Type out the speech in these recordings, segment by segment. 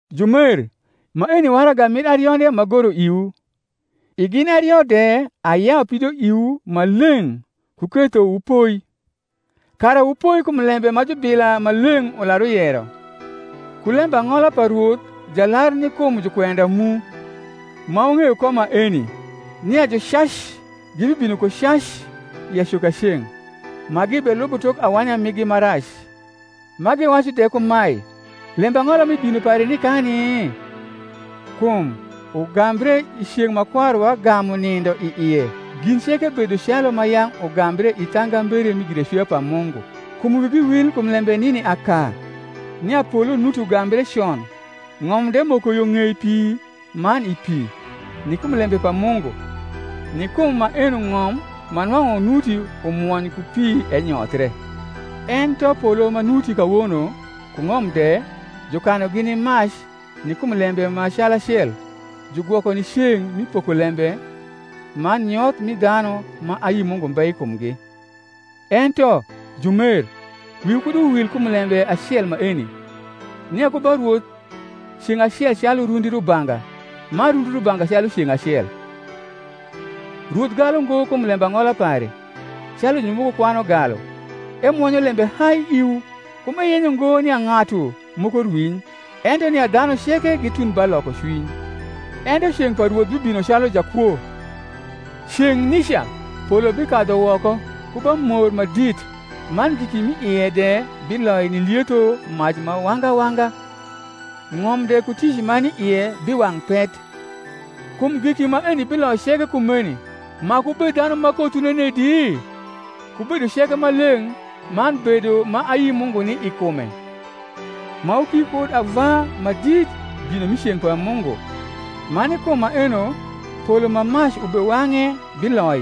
Jumer, maeni waraga mir arionde m’agoro iwu; i gin ario de ayau pidoiwu ma leng’ ku ketho wupoi; kara wupoi kum lembe ma jubila maleng’ ular uyero, ku lembang’ola pa Rwoth Jalar ni kum jukwenda mu: ma wung’eyo ko maeni, nia jucac gibibino ku cac i acokaceng’, ma gibelubo tok awanya rnigi ma rac, ma giwacu de kumae, Lembang’ola mi bino pare nikani? kum, ugambre i ceng’ ma kwaruwa gamu nindo i ie, gin ceke bedo calu ma yang’ ugambre i thangambere mi giracwia pa Mungu. Kum wigi wil kum lembe nini aka, nia polo nuti ugambre con, ng’om de moko yo ng’ei pi man i pi, ni kum lembe pa Mungu; ni kum maeno ng’om ma nwang’u nuti umwony ku pi, enyothie; ento polo ma nuti kawono, ku ng’om de, jukanugi ni mac ni kum lembe ma calacel, jugwoko ni ceng’ mi pokolembe man nyoth mi dhanu ma ayi Mungu mbe i kumgi. Ento, jumer, wiwu kud uwil kum lembe acel maeni, nia ku ba Rwoth ceng’ acel calu rundi rubanga, man rundi rnbanga calu ceng’ acel. Rwoth galu ngo kum lembang’ola pare, calu jumoko kwanu galu; ento emwonyo lembe hai iwu, kum eyenyo ngo nia ng’atu moko rwiny, ento nia dhanu ceke gitund ba lokocwiny. Ento ceng’ pa Rwoth bibino calu jakwo; ceng’ nica polo bikadhu woko ku bamor ma dit, man giki m’i ie de biloi ni lietho mac ma wanga wanga, ng’om de ku tic ma ni ie biwang’ pet. Kum giki maeni biloi ceke kumeni, maku wubed dhanu ma kothwu nenedi? ku bedo ceke ma leng’ man bedo ma ayi Mungu ni i kume, ma wuki kud ava ma dit bino mi ceng’ pa Mungu, ma ni kum maeno polo ma mac ubewang’e biloi,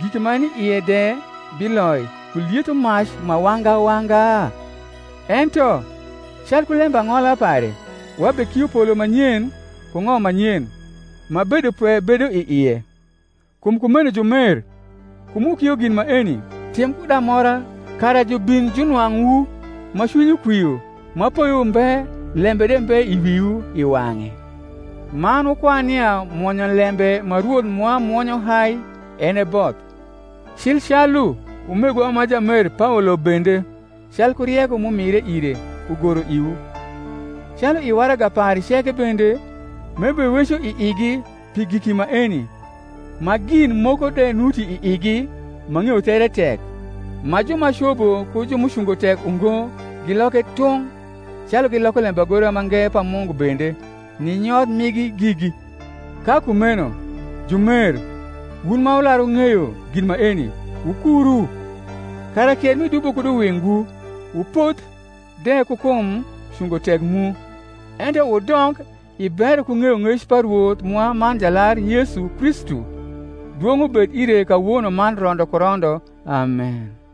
giki ma ni ie de biloi ku lietho mac ma wanga wanga? Ento, calku lembang’ola pare, wabekio polo ma nyen ku ng’om ma nyen, ma bedopwe bedo i ie. Kum kumeno, jumer, kum wukio gin maeni, tim kud amora kara jubin junwang’wu ma cwinywu kwio, ma poyo mbe lembe de mbe i wiwu i wang’e. Man wukwan nia mwonyolembe ma Rwoth mwa mwonyo hai en e both; cil calu umegwa ma jamer Paolo bende, calku rieko m’umire ire, ugoro iwu; calu i waraga pare ceke bende, m’ebeweco i igi pi giki maeni; ma gin moko de nuti i igi ma ng’eyo there tek, ma ju ma cobo ku ju m’ucungo tek ungo giloke tung’, calu giloko lembagora mange pa Mungu bende, ni nyoth migi gigi. Ka kumeno, jumer, wun ma wular wung’eyo gin maeni, wukuru, kara kier rni dubo kud uwingwu, wupodh de ku kum cungo tek mu. Ento wudong i bero ku ng’eyong’ec pa Rwoth mwa man Jalar Yesu Kristu. Dwong’ ubed ire kawono man rondo ku rondo. Amen.